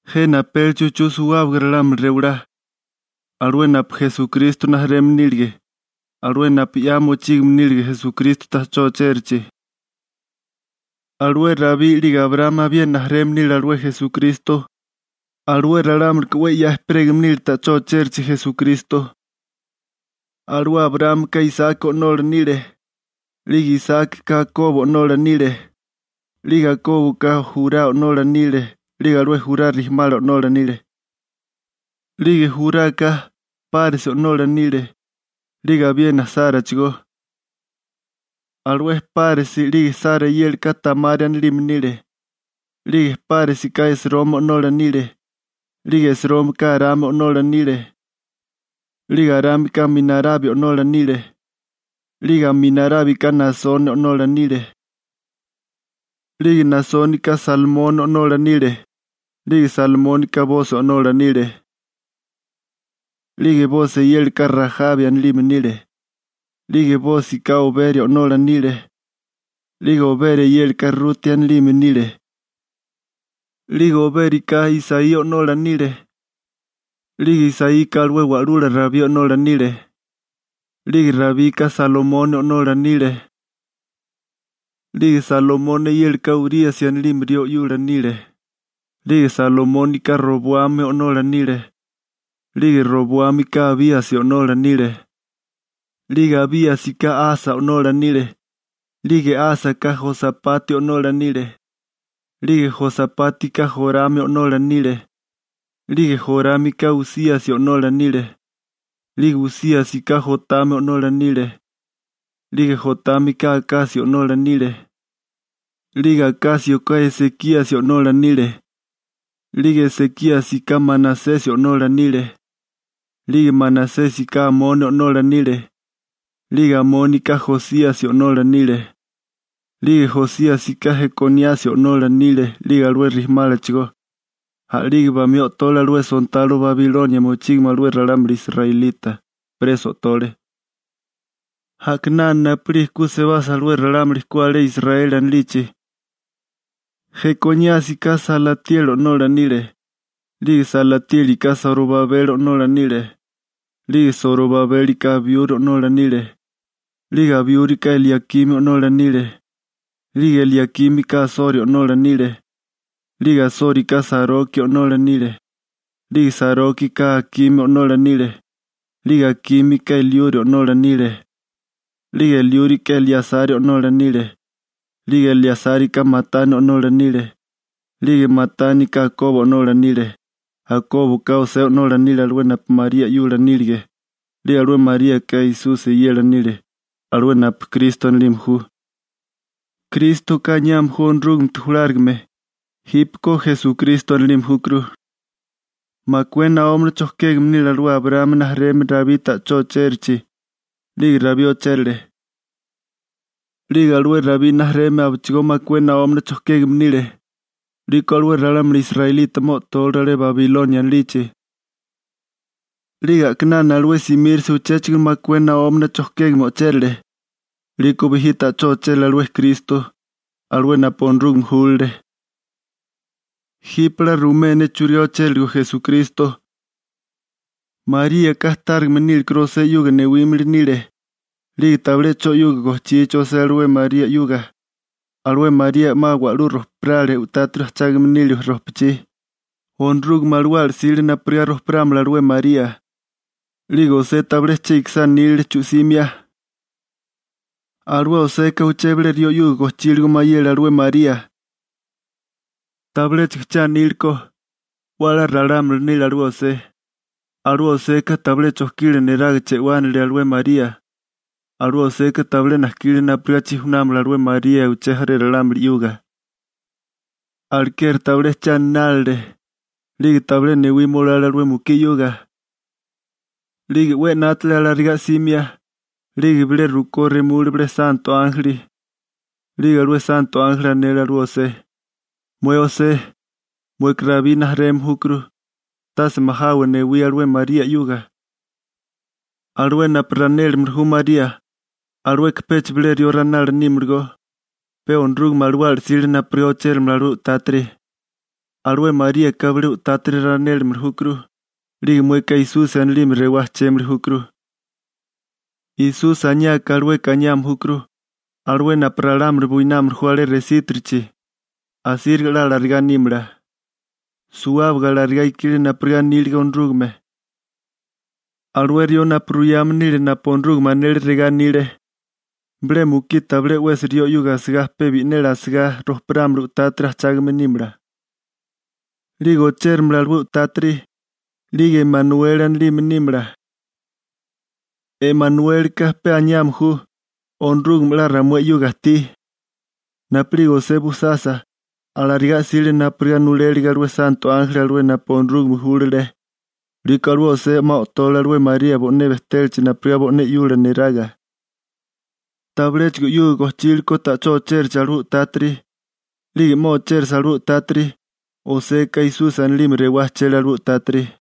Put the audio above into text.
Jena apélichi uchú suwábaga ralámuli rewalá, alué napu Esukristo rijimala nílige, alué napu 'ya mochígame nílige Esukristo ta'chó ochérachi. Alué Rabí 'lige Abraámi abiena rijimala nile alué Esukristo, alué ralámulika 'we 'ya ejperégame nílechigó ta'chó ochérichi Esukristo. Alué Abraámika Isaki o'nola nile. 'Lige Isákika Akobo o'nola nile. 'Lige Akóboka Jurá o'nola nile 'lige alué Jurá chega rijimala o'nola nile. 'Lige Juraka Páresi o'nola nile, 'lige abiena Sárachigó. Alué Páresi 'lige Sara eyélaka Tamari anilime nile. 'Lige Páresika Esromi o'nola nile. 'Lige Esrómika Arami o'nola nile. 'Lige Arámika Aminarabi o'nola nile. 'Lige Aminarábika Naasoni o'nola nile. 'Lige Naasónika Salmoni o'nola nile. 'Lige Salmónika Bosi o'nola nile. 'Lige Bosi eyélaka Rajabi anilime nile. 'Lige Bósika Oberi o'nola nile. 'Lige Oberi eyélaka Ruti anilime nile. 'Lige Obérika Isaí o'nola nile. 'Lige Isaíka alué wa'lula Rabí o'nola nile. 'Lige Rabika Salomoni o'nola nile. 'Lige Salomoni eyélaka Uríasi anilime rió 'yula nile. 'Lige Salomónika Roboami o'nola nile. 'Lige Roboámika Abíasi o'nola nile. 'Lige Abíasika Asa o'nola nile. 'Lige Ásaka Josapati o'nola nile. 'Lige Josapátika Jorami o'nola nile. 'Lige Jorámika Usíasi o'nola nile. 'Lige Usíasika Jotami o'nola nile. 'Lige Jotámika Akasio o'nola nile. 'Lige Akásioka Esekíasi o'nola nile. 'Lige Esekíasika Manasesi o'nola nile. 'Lige Manasésika Amoni o'nola nile. 'Lige Amónika Josíasi o'nola nile. 'Lige Josíasika Jekoníasi o'nola nile 'lige alué chega rijimálachigó. A'lige bamí o'tole alué sontalo Babilonia mochígame alué ralámuli israelita, preso o'tole. A'kinana napu'lige ku sebasa alué ralámuli ku alé Israeli anilichi, Jekoníasika Salatieli o'nola nile. 'Lige Salatiélika Sorobabeli o'nola nile. 'Lige Sorobabélika Abiuri o'nola nile. 'Lige Abiúrika Eliakimi o'nola nile. 'Lige Eliakímika Asori o'nola nile. 'Lige Asórika Saroki o'nola nile. 'Lige Sarókika Akimi o'nola nile. 'Lige Akímika Eliuri o'nola nile. 'Lige Eliúrika Eleasari o'nola nile. 'Lige Eleasárika Matani o'nola nile. 'Lige Matánika Akobo o'nola nile. Akóboka José o'nola nile alué napu María 'yula nílige. 'Lige alué Maríaka Esusi eyela nile, alué napu Kristo anilime ju. (Krístoka aniame ju Onorúgamete julárigame. Jípeko Esukristo anilime júkuru.) Makué naómana chojkégame nile alué Abraámi rijimala Rabí ta'chó ochérachi, 'lige Rabí ochérale. 'Lige alué Rabí rijimala abechigó makué naómana chojkégame nile. 'Liko alué ralámuli israelita 'ma o'tóleru alé Babilonia anilichi. 'Lige a'kinana alué simírasa uchéchigo makué naómana chojkégame o'chérale. 'Liko bijí ta'chó ochérale alué Kristo, alué napu Onorúgame júlale. Jipe 'la ruimé ne churigá ochériligo Esukristo: Maríaka tárigame nílekuru José 'yuga newímili nile, 'lige tabilé 'cho 'yuga gojchichi José alué María 'yuga, alué María 'ma wa'lú rojparale u'tátiri ajchágame nile rojpachí, Onorúgame Alawala 'sile napurigá rojparámala alué María. 'Lige José tabilé che ikisá nílele chu'simia. Alué Joseka uché bilé rió 'yuga gojchíligo mayele alué María. Tabiléchigo che aníleko, 'we a'lá ralámuli nile alué José, alué Joseka tabilé chojkila neraga che'wánilile alué María. Alué Joseka tabilé najkile napurigá chijunámala alué María uché jaré ralámuli 'yuga. Alekeri tabilé che aninálile, 'lige tabilé newima olale alué mukí 'yuga. 'Lige 'we 'nátale alarigá 'simia, 'lige bilé rukó remule bilé santo ánjeli. 'Lige alué santo ánjeli anele alué José: ―Mué José, mueka Rabí rijimala júkuru, alué 'we 'ya bejtégame. Tase majawa newía alué María 'yuga. Alué napu ranélimili ju María, alueka pecha bilé rió ranala nímalagó, pe Onorúgame Alawala 'sile napurigá ochéramala alué u'tátiri. Alué Maríaka bilé u'tátiri ranélimili júkuru, 'lige mueka Esusi anilime rewá ujchémili júkuru. Esusi aniáká alueka aniame júkuru «alué napu ralámuli buinámili ju alé resítirichi.» Asíriga 'la alarigá nímala. Suwábaga alarigá ikile napurigá anílige Onorúgame. Alué rió napu ruyame nile napu Onorúgame anele regá anile: Bilé mukí tabilé 'wesi rió 'yuga asigá pe bi'neli asigá rojparámala u'tátiri ajchágame nímala. 'Lige ochéramala alué u'tátiri, 'lige Emanueli anilime nímala. Emanuélika pe aniame ju «Onorúgame 'la ramué 'yuga ajtí.» Napu'lige José bujsasa, alarigá 'sile napurigá nulélige alué santo ánjeli alué napu Onorúgame júlale. 'Liko alué José 'ma o'tole María bo'né bejtélachi napurigá bo'né 'yula neraga. Tabiléchigo 'yuga gojchile ko ta'chó ochérachi alué u'tátiri, 'lige 'ma ochérasa alué u'tátiri, Joseka Esusi anilime rewá ajchele alué u'tátiri.